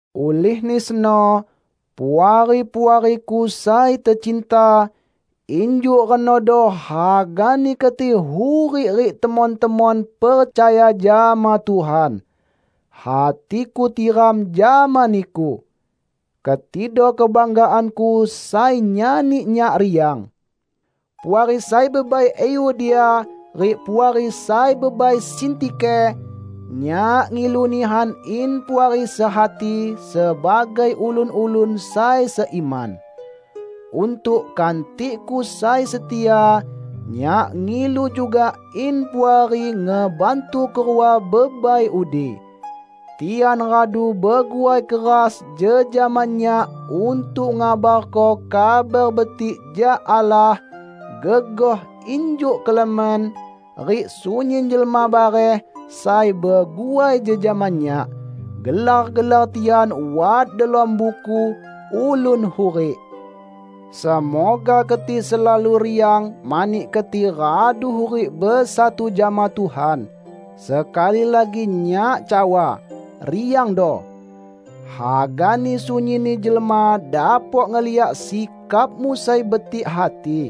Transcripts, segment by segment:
Ulihni seno, Puari-puariku sai tecinta, injuk renodo hagani keti hurik rik temon-temon percaya jama Tuhan. Hatiku tiram jama niku! Ketido kebanggaanku sai nyani nyak riang. Puari sai bebai Euodia rik Puari sai bebai Sintike! Nyak ngilu nihan in Puari sehati sebagai ulun-ulun sai seiman. Untuk kantikku sai setia, nyak ngilu juga in Puari ngebantu kerua bebai udi. Tian radu beguai keras jejama nyak untuk ngabarko Kabar Betik jak Allah; gegoh injuk Klemen rik sunyin jelma bareh sai beguai jejama nyak. Gelar-gelar tian wat delom Buku Ulun Hurik. Semoga keti selalu riang mani keti radu hurik besatu jama Tuhan. Sekali lagi nyak cawa: riangdo! Hagani sunyinni jelma dapok ngeliak sikapmu sai betik hati.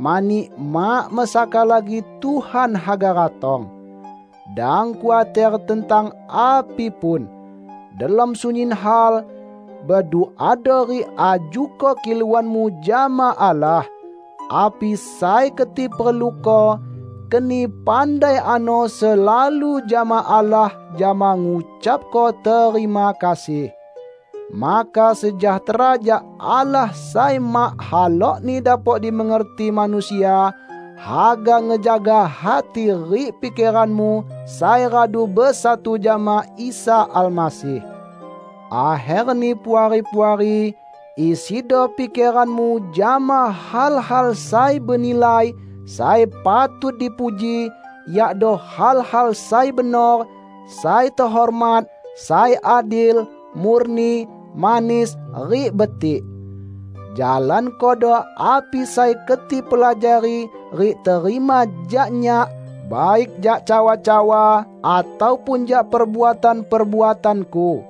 Mani mak mesaka lagi Tuhan haga ratong. Dang khuater tentang api pun. Delom sunyin hal, beduado rik ajuko kiluanmu jama Allah. Api sai keti perluko, keni pandai ano selalu jama Allah jama ngucapko terima kasih. Maka sejahtera jak Allah sai mak halokni dapok dimengerti manusia, haga ngejaga hati rik pikeranmu sai radu besatu jama Isa Almasih. Akherni Puari-puari, isido pikeranmu jama hal-hal sai benilai, sai patut dipuji, yakdo hal-hal sai benor, sai tehormat, sai adil, murni, manis, rik betik. Jalankodo api sai keti pelajari rik terima jak nyak; baik jak cawa-cawa ataupun jak perbuatan-perbuatanku.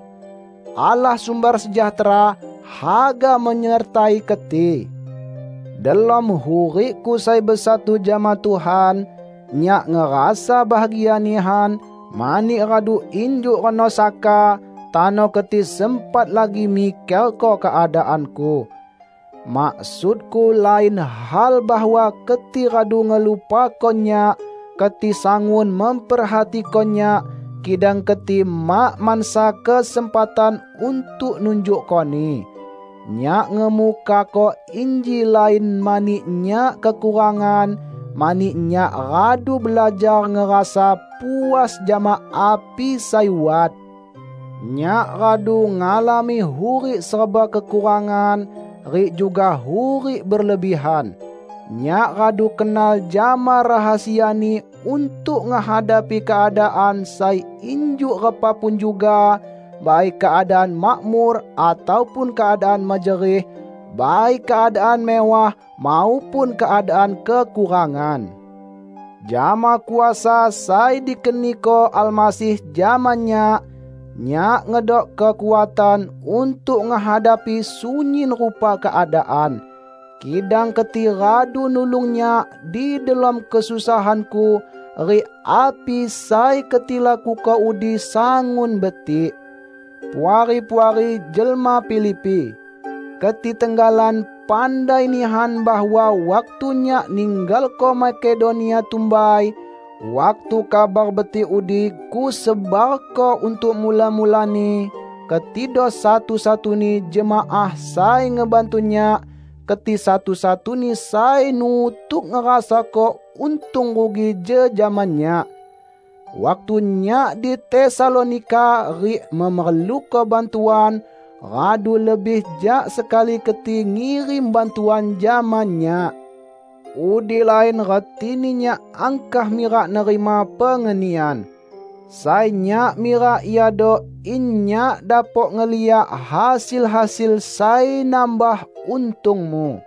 Allah sumber sejahtera, haga menyertai keti. Delom hurikku sai besatu jama Tuhan, nyak ngerasa bahagia nihan, mani radu injuk reno saka, tano keti sempat lagi mikerko keadaanku. Maksudku lain hal bahwa keti radu ngelupako nyak, keti sangun memperhatiko nyak, kidang keti mak mansa kesempatan untuk nunjukkoni. Nyak ngemukako inji lain mani nyak kekurangan, mani nyak radu belajar ngerasa puas jama api sai wat. Nyak radu ngalami hurik serba kekurangan, rik juga hurik berlebihan. Nyak radu kenal jama rahasiani untuk ngehadapi keadaan sai injuk repa pun juga; baik keadaan makmur ataupun keadaan mejerih, baik keadaan mewah maupun keadaan kekurangan. Jama kuasa sai dikeniko Almasih jama nyak, nyak ngedok kekuatan untuk ngehadapi sunyin rupa keadaan. Kidang keti radu nulung nyak di delom kesusahanku; rik api sai keti lakuko udi sangun betik. Puari-puari jelma Filipi! Keti tenggalan pandai nihan bahwa waktu nyak ninggalko Makedonia tumbai, waktu Kabar Betik udi kusebarko untuk mula-mulani, ketido satu-satuni jemaah sai ngebantu nyak; keti satu-satuni sai nutuk ngerasako untung rugi jejama nyak. Waktu nyak di Tesalonika rik memerluko bantuan, radu lebih jak sekali keti ngirim bantuan jama nyak. Udi lain retini nyak angkah mirak nerima pengenian. Sai nyak mirak iado in nyak dapok ngeliak hasil-hasil sai nambah untungmu.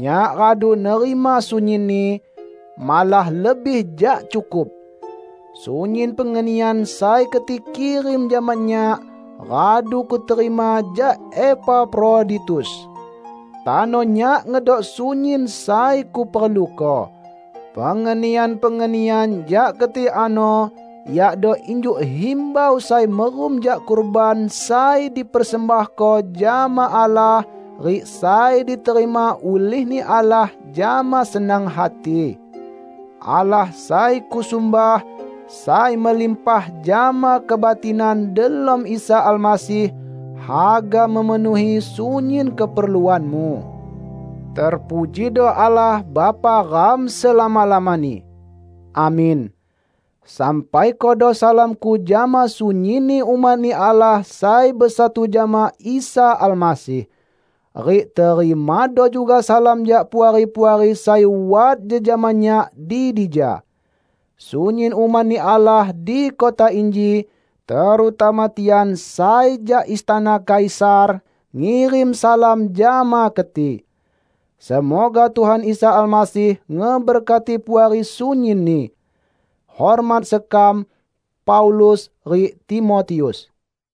Nyak radu nerima sunyinni -- malah lebih jak cukup! Sunyin pengenian sai keti kirim jama nyak, radu kuterima jak Epafroditus. Tano nyak ngedok sunyin sai kuperluko. Pengenian-pengenian jak keti ano yakdo injuk himbau sai merum jak kurban sai dipersembahko jama Allah rik sai diterima ulih-Ni Allah jama senang hati. Allah sai kusumbah, sai melimpah jama kebatinan delom Isa Almasih, haga memenuhi sunyin keperluanmu. Terpujido Allah Bapa ram selama-lamani! Amin. Sampaikodo salamku jama sunyinni umat-Ni Allah sai besatu jama Isa Almasih. Rik terimado juga salam jak puari-puari sai wat jejama nyak di dija. Sunyin umat-Ni Allah di kota inji, terutama tian sai jak istana Kaisar, ngirim salam jama keti. Semoga Tuhan Isa Almasih ngeberkati Puari sunyinni. Hormat sekam, Paulus rik Timotius